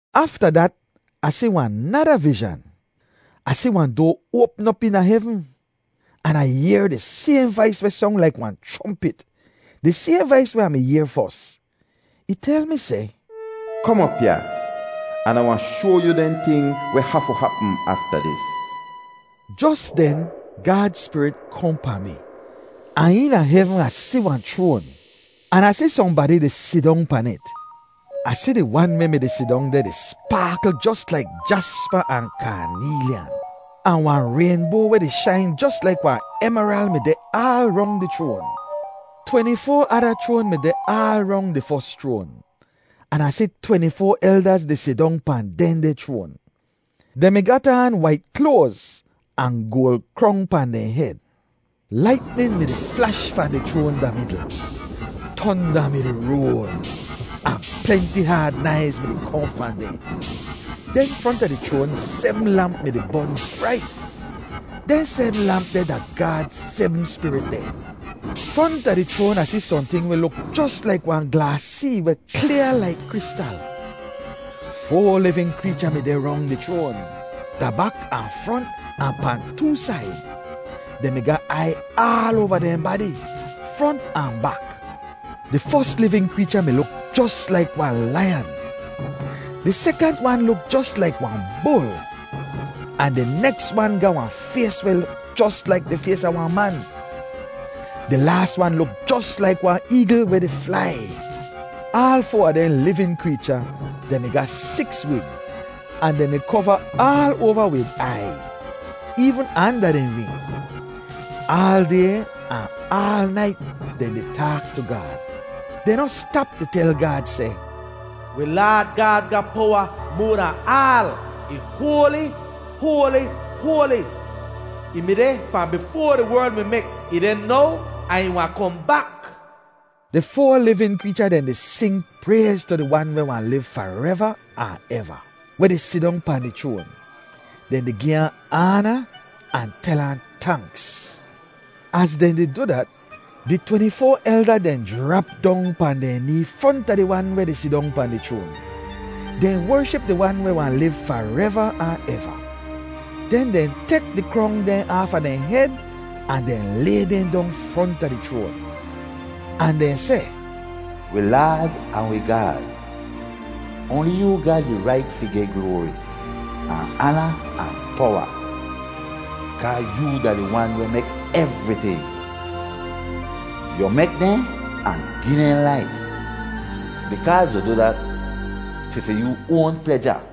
Afta dat, Ah si wahn nada vizhan. Ah si wahn doa oapm op eena hevn. An Ah yehr di sayhn vais weh song laik wahn chrompit, di sayhn vais weh Ah mi yehr fos. Ih tel mi seh, “Kom op ya, an Ah wahn shoa yu dehn ting weh hafu hapm afta dis.” Jos den Gaad Spirit kohn pahn mi, ahn eena hevn Ah si wahn chroan, an Ah si sohnbadi di sidong pan it. Ah si di Wan weh mi-di sidong deh di spaakl jos laik jaspa ahn kaaneelyan. Ahn wahn raynboa weh di shain jos laik wahn emeral mi deh aal rong di chroan. Tweni-foa ada chroan mi deh aal rong di fos chroan. An Ah si tweni-foa eldaz di sidong pahn dehndeh chroan. Dehn mi gat aan wait kloaz, ahn goal krong pahn dehn hed. Laitnin mi-di flash fahn di chroan da midl. Tonda mi-di roal, ahn plenti haad naiz mi-di kohn fahn deh. Den fronta di chroan sebm lamp mi-di bon brait. Dehn sebm lamp deh da Gaad sebm spirit dehn. Fronta di chroan Ah si sohnting weh luk jos laik wahn glaas see weh klyaa laik kristal. Foa livin kreecha mi deh rong di chroan, da bak ahn front ahn pahn too said. Dehn mi ga aiy aal oava dehn badi, front ahn bak. Di fos livin kreecha mi luk jos laik wahn laiyan. Di sekant wan luk jos laik wahn bul. Ahn di neks wan ga wahn fays weh luk jos laik di fays a wahn man. Di laas wan luk jos laik wahn eegl weh di flai. Aal foa a dehn livin kreecha, dehn mi ga siks wing, ahn dehn mi kova aal oava wid aiy, eevn anda dehn wing. Aal day ahn aal nait dehn di taak tu Gaad. Dehn noh stap di tel Gaad seh, “Wi Laad Gaad ga powa moa dahn aal. Ih hoali, hoali, hoali. Ih mi deh fahn bifoa di werl mi mek, ih deh now, ahn ih wahn kohn bak.” Di foa livin kreecha dehn di sing prayz tu di Wan weh wahn liv fareva ahn eva, weh di sidong pahn di chroan. Dehn di gi ahn aana ahn tel ahn tanks. Az dehn di du dat, di tweni-foa elda dehn jrap dong pahn dehn nee fronta di Wan weh di sidong pahn di chroan. Dehn wership di Wan weh wahn liv fareva ahn eva. Den dehn tek di krong dehn aafa dehn hed ahn dehn lay dehn dong fronta di chroan. Ahn dehn seh, “Wi Laad ahn wi Gaad, oanli yoo ga di rait fi geh gloari, ahn aana ahn powa, kaa yoo da di Wan weh mek evriting. Yu mek dehn ahn gi dehn laif, bikaaz yu du dat fi fi yoo oan pleja.”